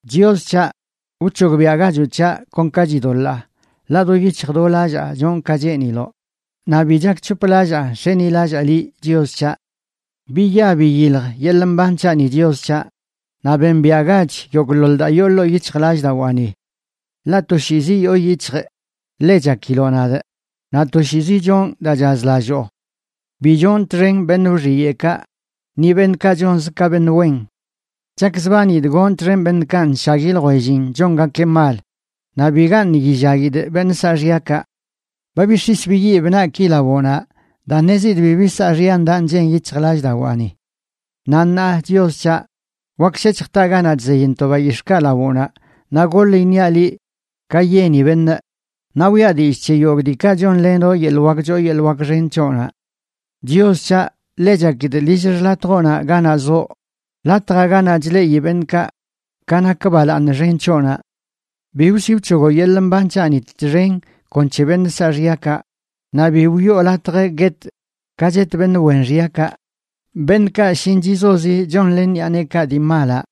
Chios c̱haꞌ, wc̱hogbiaꞌgachoꞌ c̱haꞌ kon ka chidoḻaa, ḻaꞌ do yic̱hj do lallaa chonꞌ ka cheeniloꞌ, naꞌ bi chakc̱hoplallaa nx̱enilallaa liꞌ, Chios c̱haꞌ. Biya biyilj yeḻꞌ mban c̱haꞌni, Chios c̱haꞌ, naꞌ bembiaꞌgach yogꞌḻoḻ daa yoo ḻoo yic̱hjlallꞌdawaani. Ḻaꞌ toshiizi yoo yic̱hjꞌ ḻe chakiloꞌ nadꞌ naꞌ toshiizi chonꞌ daa chazlalloo. Bi chonꞌ txen beṉꞌ wxiyeꞌkaꞌ, ni beṉꞌkaꞌ chonz ka beṉꞌ wen. Chakzbanidꞌ gonꞌ txen beṉꞌkaꞌ nshagui ljwellin chongakeꞌ mal; naꞌ bigaṉꞌ yillaguidꞌ beṉꞌ saaxyakaꞌ. Ba bix̱is biyib naꞌki lawoꞌnaꞌ daa ṉezidꞌ bibi saaxya ndaꞌ nchen yic̱hjlallꞌdawaani. Naꞌ ṉaa, Chios c̱haꞌ, wak shec̱hj taꞌ ganaꞌ chzeyntoꞌ bayix̱ꞌkaꞌ lawoꞌnaꞌ, naꞌ goḻ iṉiaꞌ liꞌ ka yeni beṉꞌ, naꞌ wiꞌa dillꞌ c̱he yogꞌ diikaꞌ chonlenoꞌ yeḻꞌ wak choo yeḻꞌ wak xen c̱hoꞌnaꞌ. Chios c̱haꞌ, ḻe chakidꞌ lill xḻatjoꞌnaꞌ ganaꞌ zoꞌ, latjaꞌ ganaꞌ chleꞌi beṉꞌkaꞌ ka nak balaaṉ xen c̱hoꞌnaꞌ. Bi wsi wc̱hogoꞌ yeḻꞌ mban c̱haꞌni txen kon c̱he beṉꞌ saaxyakaꞌ, naꞌ bi wiꞌo latj guetꞌ ka chet beṉꞌ wen xyakaꞌ, beṉꞌkaꞌ shinchizozi chonlen ṉiꞌa neekaꞌ dii malaꞌ,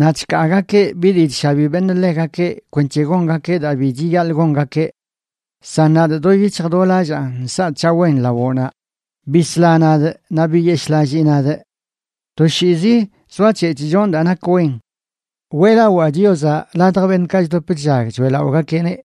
naꞌ chkaagakeꞌ bi dii chshabi beṉꞌ ḻegakeꞌ kwenc̱he gongakeꞌ daa bi chiyaḻꞌ gongakeꞌ. San nadꞌ do yic̱hj do lallaa nsaꞌ c̱haꞌ wen lawoꞌnaꞌ; bisla nadꞌ naꞌ biyeshꞌlallii nadꞌ. Toshiizi zoac̱hec̱hꞌ chonꞌ daa nak wen. Weꞌlawaa Chiozaꞌ ladj beṉꞌkaꞌ chdop chllag choeꞌlaꞌogakeꞌneꞌ.